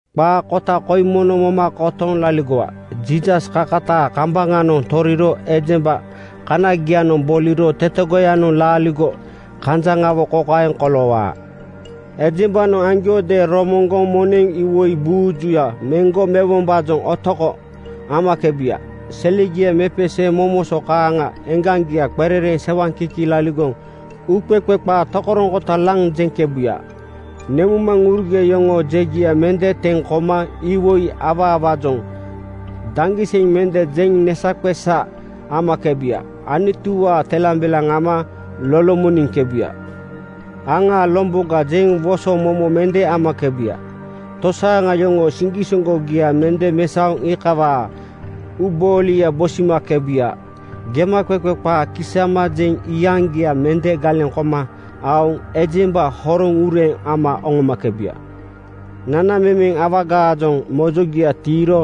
Qaa kota koi mono moma kotoŋ laligowa: Jiisas kakataa kambaŋanoŋ toriro ejemba kaniagianoŋ boliro tetegoyanoŋ laaligo kanjaŋawo kokaeŋ koloowaa: Ejembanoŋ aŋgiaajoŋadeeŋ romoŋgoŋ moneŋ iwoi buuju meŋgo mewombaajoŋ otoko (greed) amakebuya. Selegia mepeseeŋ momoso kaaŋa eŋgaŋgia qerereeŋ sewaŋkiki laligoŋ uuqeqe qaa tokoroŋkota laŋ jeŋkebuya. Nemuŋmaŋurugia yoŋoo jegia mende teŋ koma iwoi awaawaajoŋ daŋgiseŋ mende jeŋ nesaqesa (neŋhololo) amakebuya. Anutuwaa telambelaŋ ama lolomoniŋkebuya. “Aŋaa lomboga,” jeŋ woso momo mende amakebuya. Tosaaŋa yoŋoo siŋgisoŋgogia mende mesaoŋ iikawaa uuboolia bosimakebuya. Gemaqeqe qaa kisama jeŋ iyaŋgia mende galeŋ koma aoŋ ejemba horoŋ ureeŋ ama oŋomakebuya. Nanamemeŋ awagaajoŋ mojogia tiiro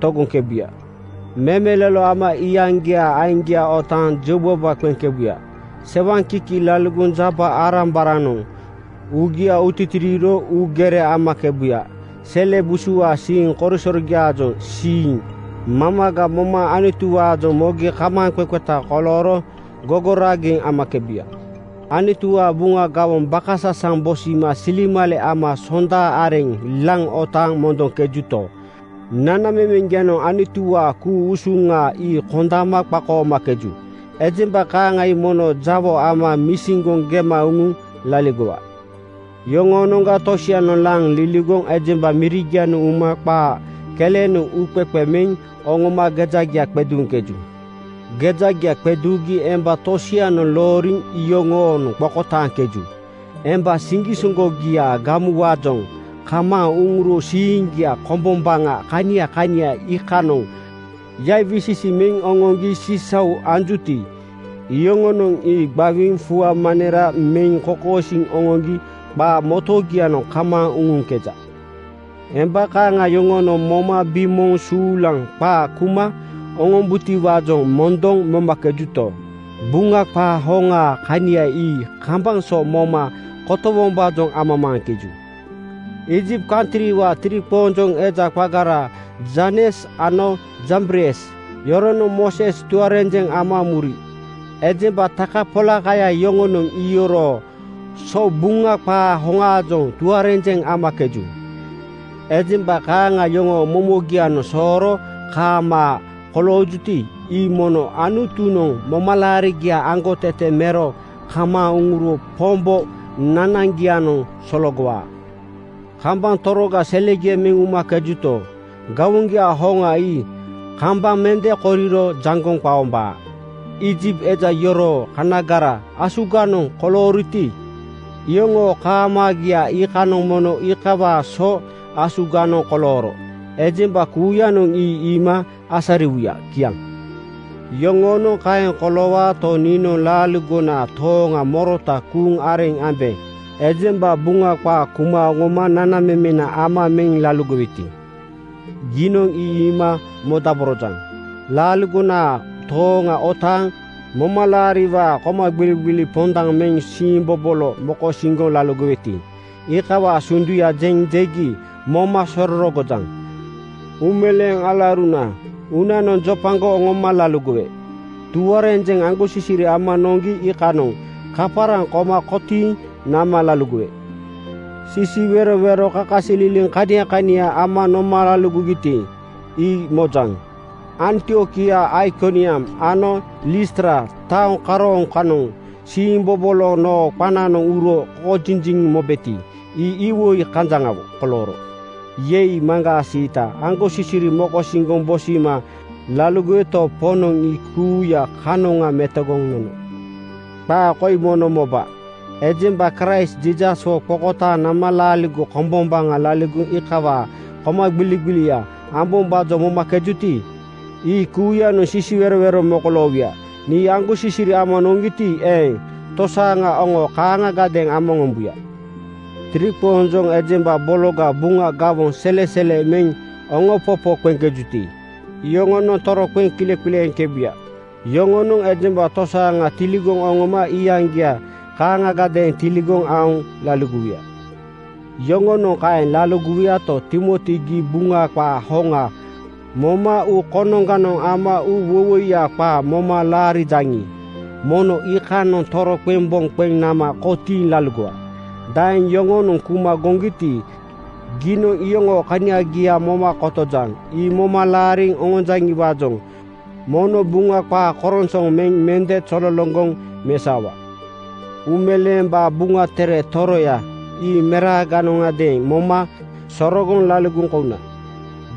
togoŋkebuya. Memelolo ama iyaŋgiaa aiŋgia otaaŋ jeubaba qeŋkebuya. Sewaŋkiki laligoŋ jaba-arambaranoŋ uugia utitiiro uugere amakebuya. Sele busuwaa siiŋ korisorogiaajoŋ siiŋ mamaga moma Anutuwaajoŋ mogi kamaaŋqeqeta kolooro gogoraageŋ amakebuya. Anutuwaa Buŋa gawoŋ bakasasaŋ bosima silemale ama Sonda areŋ laŋ otaaŋ mondoŋkejuto, nanamemeŋgianoŋ Anutuwaa ku-usuŋa ii kondama qakoomakeju. Ejemba kaaŋa ii mono jawo ama misiŋgoŋ gema uŋuŋ laligowa. Yoŋoonoŋga tosianoŋ laŋ liligoŋ ejemba mirigianoŋ uma qaa kelenoŋ uuqeqe meŋ oŋoma gejagia qeduuŋkeju. Gejagia qeduugi emba tosianoŋ looriŋ yoŋoonoŋ qokotaaŋkeju. Emba siŋgisoŋgogiaa gamuwaajoŋ kamaaŋ uŋuro siiŋgia kombombaŋa kania kania iikanoŋ yaiwisisi meŋ oŋoŋgi sisau anjuti, iyoŋonoŋ ii gbawiiŋ fua manera meŋ kokosiiŋ oŋoŋgi qaa motogianoŋ kamaaŋ uŋuŋkeja. Emba kaaŋa yoŋonoŋ moma bimooŋ suulaŋ qaa kuma oŋom-butiwaajoŋ mondoŋ momakejuto, Buŋa qaa hoŋaa kania ii kambaŋ so moma kotowombaajoŋ amamaaŋkeju. Iijipt kantriwaa tiriqoonjoŋ eja qagara Janes ano Jambres yoronoŋ Mooses tuarenjeŋ ama muri. Ejemba takapolakaya yoŋonoŋ iyoroo so Buŋa qaa hoŋaajoŋ tuarenjeŋ amakeju. Ejemba kaaŋa yoŋoo momogianoŋ sooro kaamaa koloojuti, ii mono Anutunoŋ momalaarigia aŋgotete mero kamaaŋ uŋuro Pombo nanaŋgianoŋ sologowaa. Kambaŋ toroga selegia meŋ umakebuto, gawoŋgiaa hoŋa ii kambaŋ mende koriro jaŋgoŋ qaombaa. Iijipt eja yoroo kaniagara asuganoŋ kolooroti, iyoŋoo kaamaagiaa kanianoŋ mono iikawaa so asuganoŋ kolooro ejemba kuuyanoŋ ii iima asariwuya. Kiaŋ. Yoŋoonoŋ kaeŋ koloowaato, niinoŋ laaligonaa tooŋa morota kuuŋ areŋ ambe. Ejemba Buŋa qaa kuma oŋoma nanamemena ama meŋ laligoweti giinoŋ ii iima modaborojaŋ. Laaligonaa tooŋa otaaŋ momalaariwaa komagbiligbili pondaŋ meŋ siimbobolo mokosiŋgoŋ laligoweti iikawaa sunduya jeŋ jegi moma sorogojaŋ. Uumeleeŋ alauruna uunanoŋ jopagoŋ oŋoma laligowe. Tuarenjeŋ aŋgosisiri ama noŋgi iikanoŋ kaparaŋ koma kotiiŋ nama laligowe. Sisiwerowero kakasililiŋ kania kania ama noma laligogiti, ii mojaŋ. Antiokia, Aikoniam ano Listra taoŋ karooŋ kanoŋ siimbobolo noo qananoŋ uro koŋajiliŋ mobeti, ii iwoi kanjaŋawo kolooro. Yei, maŋgaa siita! Aŋgosisiri mokosiŋgoŋ bosima laligoweto, Poŋnoŋ ii kuuya kanoŋa metogoŋ nono. Qaa koi mono moba: Ejemba Kraist Jiisaswo qokotaaŋ nama laaligo kombombaŋa laligoŋ iikawaa komagbiligbilia ambombaajoŋ momakejuti, ii kuuyanoŋ sisiwerowero mokoloowuya. Nii aŋgosisiri ama noŋgiti, eeŋ, tosaaŋa oŋo kaaŋagadeeŋ ama oŋombuya. Tiriqoonjoŋ ejemba bologa Buŋa gawoŋ selesele meŋ oŋompopo qeŋkejuti, iyoŋonoŋ toroqeŋ kileqileeŋkebuya. Yoŋonoŋ ejemba tosaaŋa tiligoŋ oŋoma iyaŋgia kaaŋagadeeŋ tiligoŋ aoŋ laligowuya. Yoŋonoŋ kaeŋ laligowuyato, Timoti gii Buŋa qaa hoŋa moma uu konoŋganoŋ ama uuwoiwoiya qaa moma laarijaŋi, mono iikanoŋ toroqeŋ boŋ qeŋ nama kotiiŋ laligowa. Daeŋ yoŋonoŋ kuma goŋgiti, giinoŋ iyoŋoo kaniagia moma kotojaŋ. Ii moma laariŋ oŋonjaŋiwaajoŋ mono Buŋa qaa koronsoŋ meŋ mende zololoŋgoŋ mesaowa. Uumeleembaa Buŋa Tere Toroya ii meraaganoŋadeeŋ moma sorogoŋ laligoŋ kouna.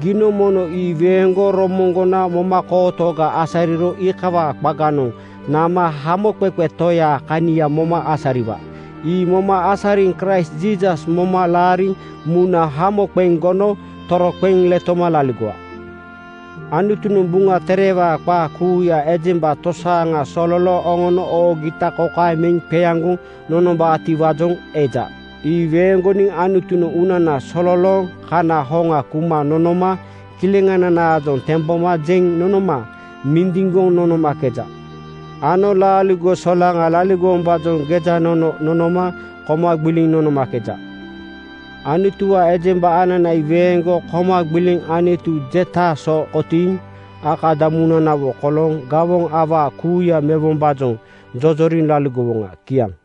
Giinoŋ mono ii weeŋgoŋ romoŋgona momakootoga asariro iikawaa qaganoŋ nama Hamoqeqe Toyaa kania moma asariwa. Ii moma asariŋ Kraist Jiisas moma laariŋ muna hamo qeŋ gono toroqeŋ letoma laligowa. Anutunoŋ Buŋa Terewaa qaaya kuuya ii ejemba tosaaŋa sololooŋ oŋono oogita kokaeŋ meŋ qeaŋgoŋ nonombaatiwaajoŋ eja: Ii weeŋgoniŋ Anutunoŋ uunana sololooŋ kana hoŋa kuma nonoma kileŋananaajoŋ temboma jeŋ nonoma mindiŋgoŋ nonomakeja ano laaligo solaŋa laligowombaajoŋ gejanono nonoma koma gbiliŋ nonomakeja. Anutuwaa ejemba anana ii weeŋgoŋ koma gbiliŋ Anutu jetaa so kotiiŋ akadamunanawo kolooŋ gawoŋ awaa kuuya mewombaajoŋ jojoriŋ laligowoŋa. Kiaŋ.